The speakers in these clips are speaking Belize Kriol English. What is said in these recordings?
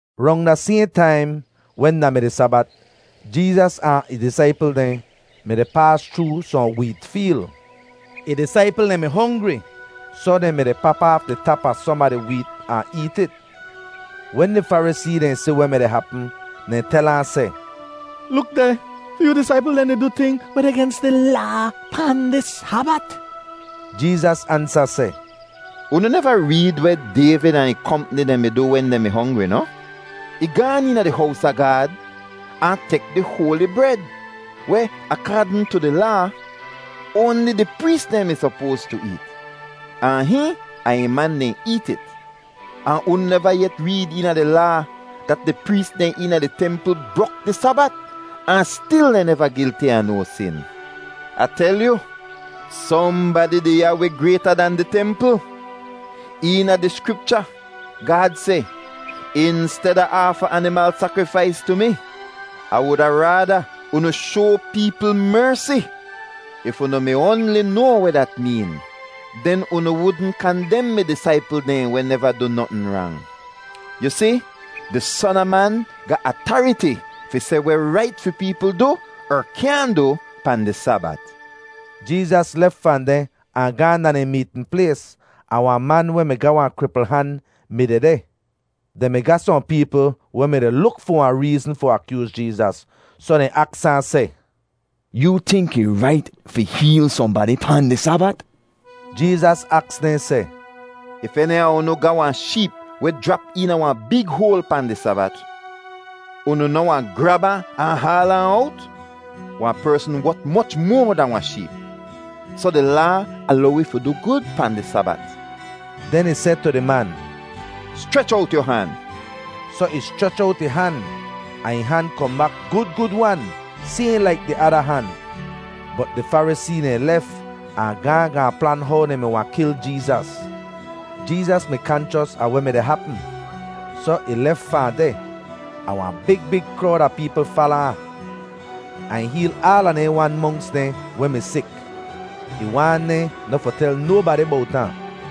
Rong da sayhn taim wen da mi di Sabat, Jeezas ahn ih disaipl dehn mi-di paas chroo sohn weet feel. Ih disaipl dehn mi hongri, soh dehn mi-di pap aaf di tap a som a di weet ahn eet it. Wen di Farisee dehn si weh mi-di hapm, dehn tel ahn seh, “Luk deh! Fi yoo disaipl dehn di du ting weh deh gens di Laa pahn di Sabat!” Jeezas ansa seh, “Unu neva reed weh Dayvid ahn ih kompni dehn mi du wen dehn mi hongri noh? Ih gaan eena di hows a Gaad ahn tek di hoali bred weh, akaadn tu di Laa, oanli di prees dehn mi sopoas tu eet; ahn hihn ahn ih man dehn eet it. Ahn unu neva yet reed eena di Laa dat di prees dehn eena di templ brok di Sabat ahn stil dehn neva gilti a no sin? Ah tel yu, sohnbadi deh ya weh grayta dan di templ. Eena di Skripcha Gaad seh, ‘Insteda aafa animal sakrifais tu mi, Ah wuda raada unu shoa peepl mersi.’ If unu mi oanli noa weh dat meen, den unu wudn kandem mi disaipl dehn weh neva du notn rang. Yu si, di Son a Man ga atariti fi seh weh rait fi peepl du er kyaahn du pahn di Sabat.” Jeezas lef fahn deh ahn gaahn da dehn meetn plays, ahn wahn man weh mi ga wahn kripl han mi dehdeh. Dehn mi ga sohn peepl weh mi-di luk fi wahn reezn fi akyooz Jeezas, soh dehn aks ahn seh, “Yoo tink ih rait fi heel sohnbadi pahn di Sabat?” Jeezas aks dehn seh, “If eni a unu ga wahn sheep weh jrap eena wahn big hoal pahn di Sabat, unu noh wahn grab ahn, ahn haal ahn owt? Wahn persn wot moch moa dahn wahn sheep. Soh di Laa alow wi fi du gud pahn di Sabat.” Den ih seh tu di man, “Schrech owt yu han.” Soh ih schrech owt ih han, ahn ih han kohn bak gud gud-wan, sayhn laik di ada han. Bot di Farisee dehn lef ahn gaahn gaahn plan how dehn mi wahn kil Jeezas. Jeezas mi kanchos a weh mi-di hapm, soh ih lef fahn deh. Ahn wahn big big krowd a peepl fala ahn, ahn ih heel aala dehn wan monks dehn weh mi sik. Ih waan dehn noh fi tel nobadi bowt ahn.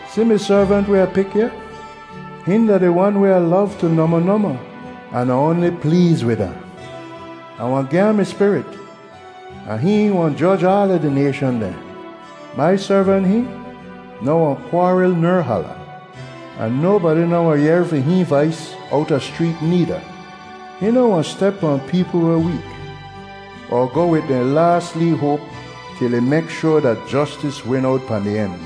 “Si mi servant weh Ah pik ya. Hihn da di Wan weh Ah lov tu nohmoh nohmoh an Ah oanli pleez wid ahn. Ah wahn gi ahn mi spirit, ahn hihn wahn joj aala di nayshan dehn. Mai servant hihn noh wahn kwaaril ner hala; ahn nobadi noh wahn yehr fi hihn vais owta schreet needa. Hihn noh wahn step pahn peepl weh week, er goh wid dehn laas lee hoap til ih mek shoar dat jostis win owt pahn di en.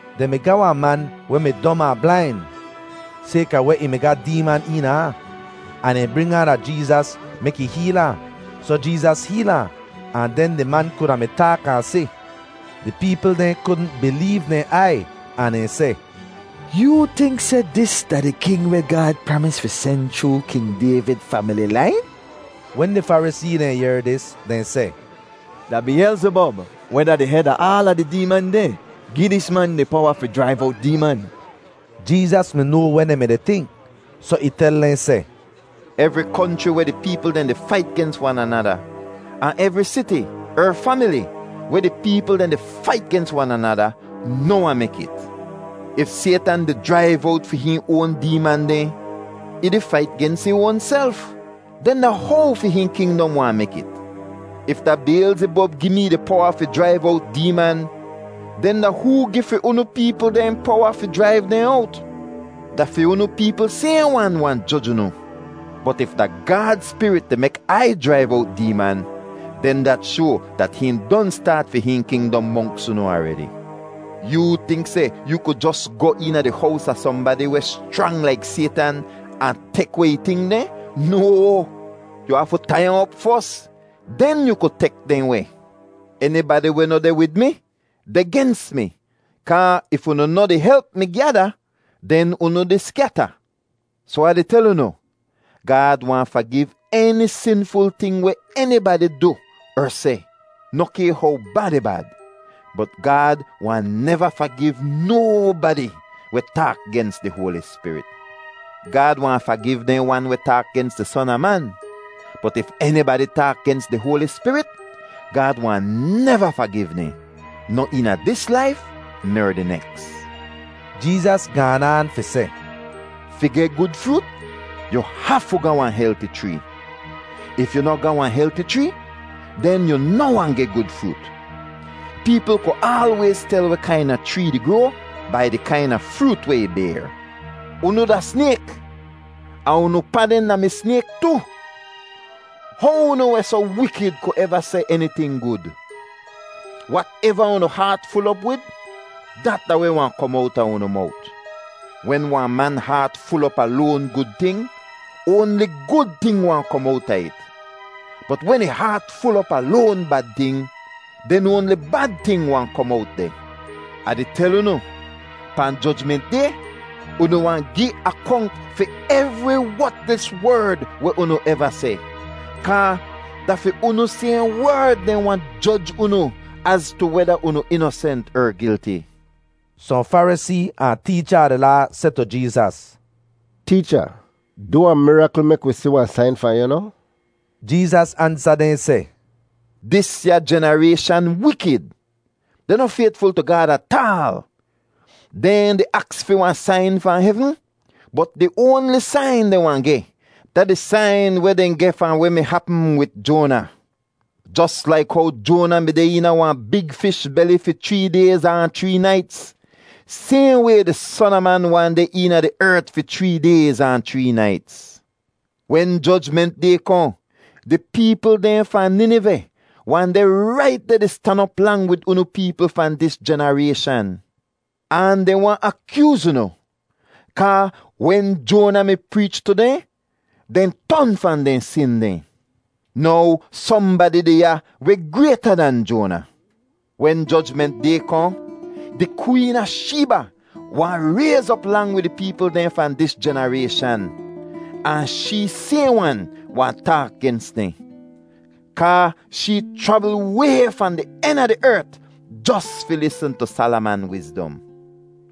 Dehn mi ga wahn man weh mi dom ahn blain sayka weh ih mi ga deeman eena ahn, ahn dehn bring ahn da Jeezas mek ih heel ahn. Soh Jeezas heel ahn, ahn den di man kuda mi taak ahn si. Di peepl dehn kudn bileev dehn aiy ahn dehn seh, “Yoo tink seh dis da di king weh Gaad pramis fi sen chroo King Dayvid famili lain?” Wen di Farisee dehn yehr dis, dehn seh, “Da Biyelzibob, weh da di hed a aala di deeman dehn, gi dis man di powa fi jraiv owt deeman.” Jeezas mi noa weh dehn mi-di tink, soh ih tel dehn seh, “Evri konchri weh di peepl dehn di fait gens wan anada, ahn evri siti er famili weh di peepl dehn di fait gens wan anada, noh wahn mek it. If Saytan di jraiv owt fi hihn oan deeman dehn, ih di fait gens ih oanself; den da how fi hihn kingdom wahn mek it? If da Biyelzibob gi mee di powa fi jraiv owt deeman, den da hoo gi fi unu peepl dehn powa fi jraiv dehn owt? Da fi unu peepl sayhn wan wahn joj unu. Bot if da Gaad Spirit di mek Ai jraiv owt deeman, den dat shoa dat hihn don staat fi hihn kingdom monks unu aredi. “Yoo tink seh yu ku jos goh eena di hows a sohnbadi weh schrang laik Saytan ahn tek weh ih ting dehn? No. Yu hafu tai ahn op fos. Den yu ku tek dehn weh. “Enibadi weh noh deh wid mi deh gens mi kaa if unu noh di help mi gyada, den unu di skyata. Soh Ah di tel unu, Gaad wahn fagiv eni sinful ting weh enibadi du er seh, noh kay how bad ih bad. Bot Gaad wahn neva fagiv nobadi weh taak gens di Hoali Spirit. Gaad wahn fagiv dehn wan weh taak gens di Son a Man, bot if enibadi taak gens di Hoali Spirit, Gaad wahn neva fagiv dehn, noh eena dis laif ner di neks.” Jeezas gaan aan fi seh, “Fi geh gud froot, yu hafu ga wahn helti chree; if yu noh ga wahn helti chree, den yu noh wahn geh gud froot. Peepl ku aalwayz tel weh kaina chree di groa bai di kaina froot weh ih bayr. Unu da snayk ahn unu pa dehn da-mi snayk tu! How unu weh soh wikid ku eva seh eniting gud? Wateva unu haat ful op wid, dat da weh wahn kom owta unu mowt. Wen wahn man haat ful op a loan gud ting, oanli gud ting wahn kom owta it, bot wen ih haat ful op a loan bad ting, den oanli bad ting wahn kom owt deh. “Ah di tel unu, pahn Jojment Day unu wahn gi akonk fi evri wotlis werd weh unu eva seh, kaa da fi unu sayhn werd dehn wahn joj unu az tu weda unu inosent er gilti.” Sohn Farisee ahn teecha a di Laa seh tu Jeezas, “Teecha, du wahn mirakl mek wi si wahn sain fahn yu noh?” Jeezas ansa dehn seh, “Disya jenarayshan wikid; dehn noh faytful tu Gaad ataal. Dehn di aks fi wahn sain fahn hevn, bot di oanli sain dehn wahn geh da di sain weh dehn geh fahn weh mi hapm wid Joana. Jos laik how Joana mi deh eena wahn big fish beli fi chree dayz ahn chree naits, sayhn way di Son a Man wahn deh eena di ert fi chree dayz ahn chree naits. Wen Jojment Day kohn, di peepl dehn fahn Niniveh wahn deh rait deh di stan op lang wid unu peepl fahn dis jenarayshan; ahn dehn wahn akyooz unu, kaa wen Joana mi preech tu dehn, dehn ton fahn dehn sin dehn. Now sohnbadi deh ya weh grayta dan Joana. Wen Jojment Day kohn, di Kween a Sheeba wahn rayz op lang wid di peepl dehn fahn dis jenarayshan ahn shee sayhn wan wahn taak gens dehn; kaa shee chravl way fahn di en a di ert jos fi lisn tu Salaman wizdom.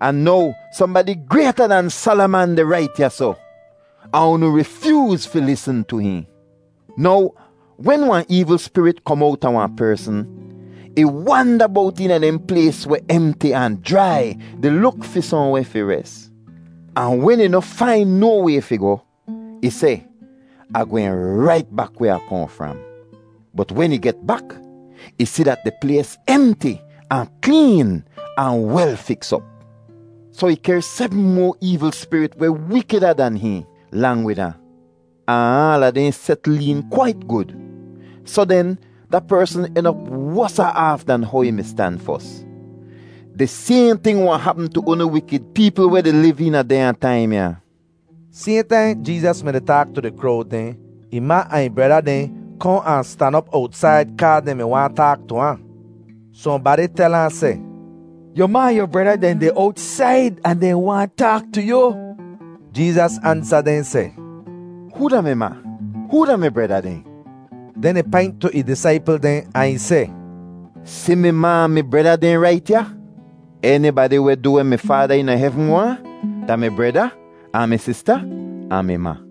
Ahn now sohnbadi grayta dan Salaman deh rait ya soh, ahn unu rifyooz fi lisn tu hihn. “Now wen wahn eevl spirit kom owta wahn persn, ih wanda bowt eena dehn plays weh emti ahn jrai di luk fi sohnweh fi res. Ahn wen ih noh fain no way fi goh, ih seh, ‘Ah gwehn rait bak weh Ah kohn fram.’ Bot wen ih get bak, ih si dat di plays emti ahn kleen ahn wel fiks op. Soh ih kehr sebm moa eevl spirit weh wikida dan hihn, lang wid ahn. Ahn aala dehn setl een kwait gud. Soh den, da persn en op wosa aaf dan how ih mi stan fos. Di sayhn ting wahn hapm tu unu wikid peepl weh di liv eena dehnya taim ya.” Sayhn taim Jeezas mi-di taak tu di krowd dehn, ih ma ahn ih breda dehn kohn ahn stan op owtsaid kaa dehn mi waahn taak tu ahn. Sohnbadi tel ahn seh, “Yu ma ahn yu breda dehn deh owtsaid ahn dehn waahn taak tu yu.” Jeezas ansa dehn seh, “Hoo da mi ma? Hoo da mi breda dehn?” Den ih paint tu ih disaipl dehn ahn ih seh, “Si mi ma ahn mi breda dehn rait ya. Enibadi weh du weh mi Faada eena hevn waahn da mi breda, ahn mi sista, ahn mi ma.”